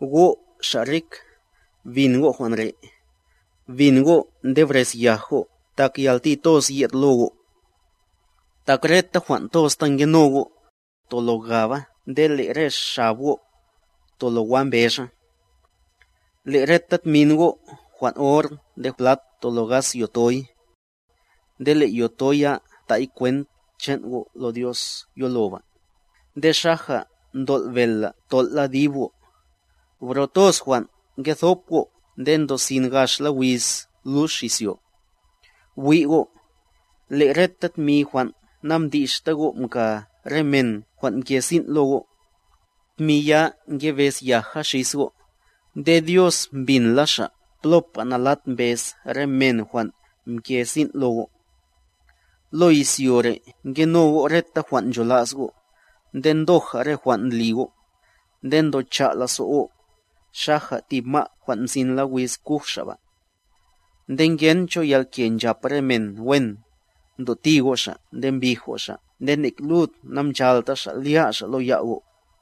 Go', xa' rik, bin go' jwan' re': bin' go' nde brez yaj go' tak yalti toz ye'd lo go'. Tak reta jwan' toz ta ngeno go', tolo gaba nde le' re xab go', tolo wa mbexa. Le' reta tmin go' jwan' or nde plat tolo gas yotoy. Nde le' yoto ya tay kwent chan' go' lo Dios yoloba, nde xaja ntol' bel la tol' la dib go'. Bro toz jwan' ngethop go' nde ndosin gax la wiz lux izyo'. Bwi' go', le' reta tmi jwan' namdixta go' mka re men jwan' mke sin' lo go', tmi ya ngebez yaj xis go'; nde Dios mbinla Xa' plopa nalat mbez re men jwan' mke sin' lo go'. Lo izyo re' nkeno go' reta jwan' ncholas go', nde ndoja re jwan' ndli go'; nde mtocha' go' go', xaja tib ma' jwan' mzin la wiz kuj xa' ba. Nde ngen cho yalke nchap re men wen, mtoti go' xa' nde mbij go' xa' nde nek lud namchalta xa' lya' xa' lo ya' go'.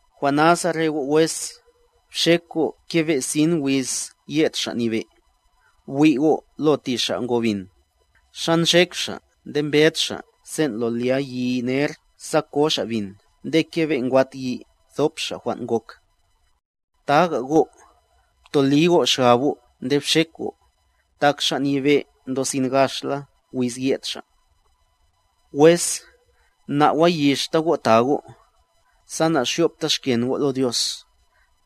Jwan' nasa re go' wes, bxek go' kebe' sin wiz ye'd Xa' Nyebe'. Bwi' go' lo ti xa' ngo bin, xa nxek xa' nde mbed xa' sen' lo lya yi ner sa ko xa' bin nde kebe' ngwat yi nthop xa' jwan' ngok. Taga go', ptoli go' xgab go' nde bxek go'; tak Xa' Nyebe' ndosin gaxla wiz ye'd xa'. Wes, na'wayixta go' ta go', sa naxyopta xken go' lo Dios;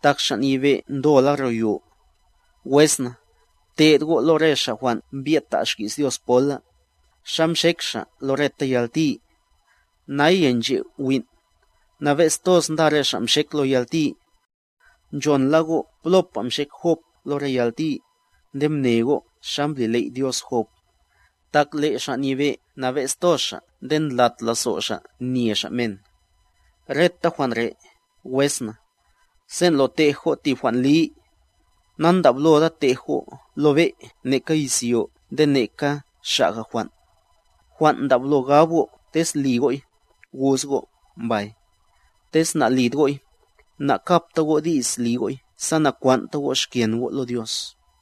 tak Xa' Nyebe' ndola ro yo. Wes na, pte'd go' lo re xa' jwan' mbyed ta' xki's Dios pola,a xa mxek xa' lo reta yalti. Naya nche' win', nabe'z toz nda re xa' nxek lo yalti. Nchon la go' plopa mxek Job lo re yalti, nde mne go' xa mbli ley' Dios Job, tak le' Xa' Nyebe' nabe'z toz Xa' nde ndlat lazo' Xa' men. Reta jwan' re', wes na, sen' lo tej go' tib jwan' li, nandabloda tej go' lo be' neka izyo nde neka xaga' jwan'; jwan' ndablo gab go' tez li go'y, gus go' “mbay”, tez nalid go'y, nakapta go' di's li go'y sa nakwan'ta go' xken go' lo Dios.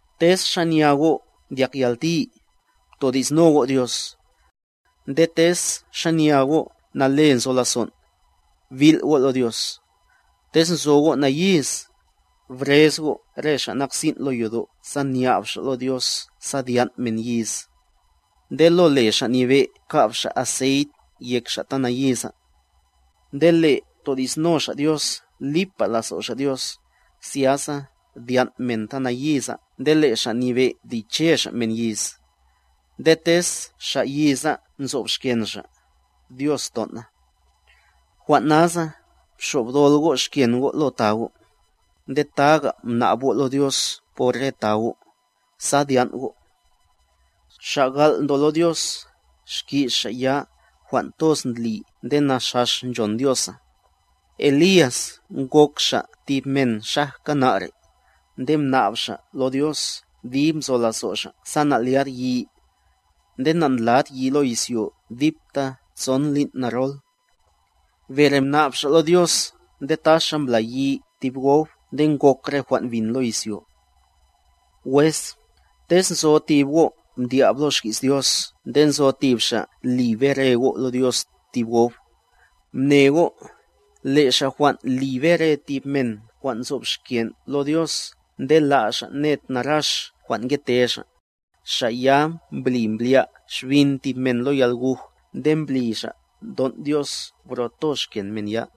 Tez xanya go' ndyak yalti, ptodi'sno go' Dios. Nde tez xanya go' nale nzo lazon', bil' go' lo Dios. Tez nzo go' nayiz, brez go' re xa' nak sin' lo yodo' sa nya'b xa' lo Dios sa dyan' men yiz, nde lo le Xa' Nyebe' ka'b xa' aseyt yek xa' ta nayiza. Nde le' todi'sno xa' Dios lipa lazo' xa' Dios, zyasa dyan' men ta nayiza nde le' Xa Nyebe' liche Xa' men yiz; nde tez xa' yiza nzob xken xa', Dios ton' na. Jwan' nasa, bxobdol go' xken go' lo ta go', nde taga' mna'b go' lo Dios por re ta go', sa dyan' go'. Xa' gal' ndo lo Dios, xki's xa' ya jwan' toz ndli nde naxax nchon Diosa. Elías ngok xa' tib men xajka na' re', nde mna'b xa' lo Dios dib nzo lazo' xa' sa na'lyad yi, nde nandlad yi lo izyo dipta tson lin' narol. Bere mna'b xa' lo Dios nde taxa mbla yi tib gob nde ngok re jwan' bin lo izyo. Wes, tez nzo tib go' mdyab lo xki's Dios nde nzo tib xa' li bere go' lo Dios tib gob. Mne go', le' xa' jwan' li bere tib men jwan' nzob xken' lo Dios nde la' xa' ned narax jwan' ngete xa', xa' ya mbli mblya' xbin tib men lo yalguj nde mbli xa' mton' Dios bro toz xken men ya.